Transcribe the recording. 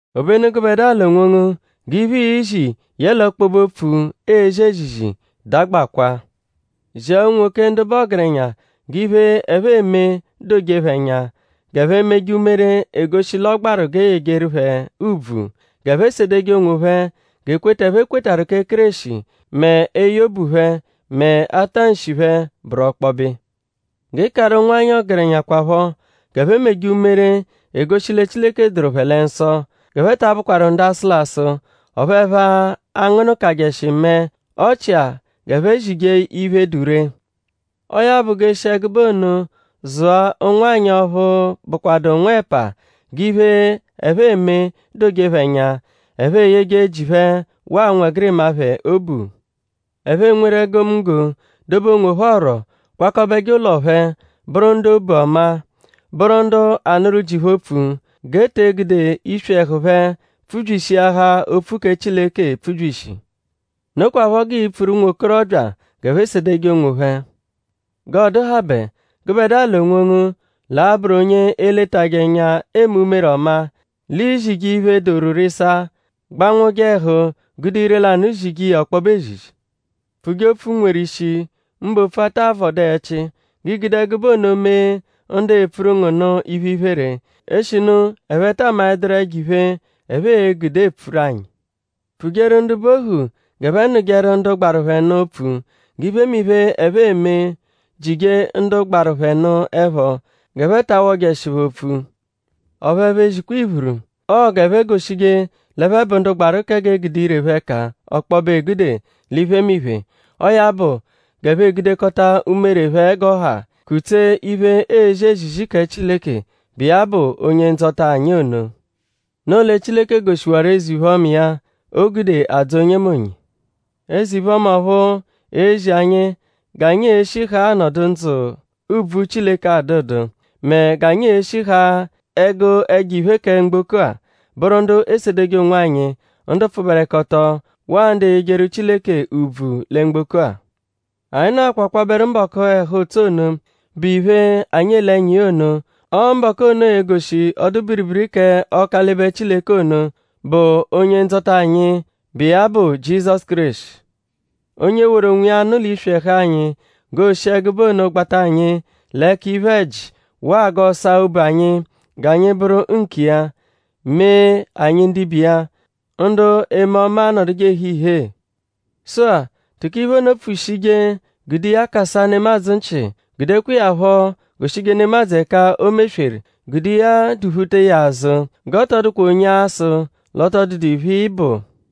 Obenu gụbedua l'onwongu; g'iphe, iizi yẹle ọkpobe-opfu, eezi ezizi dagbakwa. Zia unwoke ndu bụ ọgerenya g'iphe, ẹphe eme doje phẹ ẹnya; g'ẹphe meje umere, egoshi l'ọ gbaru g'e yejeru phẹ ùbvù; g'ẹphe sedeje onwophẹ; g'ekweta, ẹphe kwetarụ kẹ Kéreshi; mẹ eye obu phẹ; mẹ atanshi phẹ bụru ọkpobe iya. G'ị karụ ụnwanyi ọgerenya kwaphọ g'ẹphe meje umere, egoshi lẹ Chileke dụru phẹ lẹ nsọ; g'ẹphe ta abụkwaru ndu asụlasu; ọphu ẹphe angụnukajeshi mẹe; ọ chia g'ẹphe zije iphe, dụ ree. Ọo ya bụ; g'ẹphe eshi ẹgube ono zụa ụnwanyi ọphu bụkwadu nwẹpa g'iphe, ẹphe eme doje phẹ ẹnya; ẹphe eyeje ji phẹ waa ụnwegirima phẹ obu. Ẹphe enweru egomunggo; dobe onwophẹ ọ̀rù; kwakọbeje ụlo phẹ; bụru ndu obu ọma; bụru ndu anụru ji phẹ opfu; g'e te egude iswi ẹhu phẹ pfubyishiahaa opfu kẹ Chileke epfubyishi. Nokwaphọ g'ii-pfuru ụnwokorobya g'ẹphe sedeje onwophẹ. G'ọ dụhabe; gụbedua l'onwongu l'a-bụru onye e-letajẹ ẹnya eme umere ọma; l'iizije iphe, doru rịsaa; gbanwụje ẹhu gude ire-lanụ zije iya ọkpobe ezizi. Pfuje opfu, nweru ishi; mbụ opfu, aata avọdu ẹchi; g'ii-gude ẹgube ono mee ndu epfuru ngu nụ iphe-iphere; eshinu ẹphe taa maẹduru ẹjo-iphe, ẹphe e-gude epfuru anyi. Pfujeru ndu bụ ohu g'ẹphe nụjeru ndu gbaru phẹ nụ opfu; g'iphemiphe, ẹphe eme jije ndu gbaru phẹ nụ ẹpho; g'ẹphe ta awọjeshi phẹ opfu; ọphu ẹphe ezikwa iphuru. Ọo g'ẹphe goshije l'ẹphe bụ ndu gbaru kẹ g'e gude ire phẹ ẹka ọkpobe egude l'iphemiphe. Ọo ya bụ; g'ẹphe egudekọta umere phẹ g'ọ ha kutsee iphe, eezi ezizi kẹ Chileke, bụ iya bụ Onye-Ndzọta anyi ono. Noo lẹ Chileke goshiwaru eze-iphe-ọma iya, o gude adzọ onyemonye. Eze-iphe-ọma ọphu ezi anyi g'anyi e-shi haa anọdu ndzụ, ùbvù Chileke adụdu; mẹ g'anyi e-shi haa ẹgu ẹjo-iphe kẹ mgboko-a; bụru ndu esedeje onwanyi; ndu pfụberekoto; waa ndu eyejeru Chileke ùbvù lẹ mgboko-a. Anyi nọakwa kwabẹru mbọku ẹhu-ụtso ono, bụ iphe, anyi ele ẹnya iya ono. Ọo mbọku ono e-goshi ọdu-biribiri kẹ Ọkalibe Chileke ono, bụ Onye-Ndzọta anyi, bụ iya bụ Jizọsu Kéreshi. Onye woru onwiya nụ l'iswi ẹhu anyi g'oo-shi ẹgube ono gbata anyi l'ẹka iphe-ẹji; waa g'ọ saa obu anyi g'anyi bụru nkiya; mee anyi ndibe iya; ndu eme ọma anọduje ehe ihee. Sụ-a; tụko iphe ono pfushije; gude iya kasaa nemadzụ nchị; gudekwa iya phọ goshije nemadzụ ẹka o mesweru; gude iya duphuta iya azụ. G'ọ tọ dụkwa onye a-sụ l'ọ tọ dụdu iphe, ị bụ.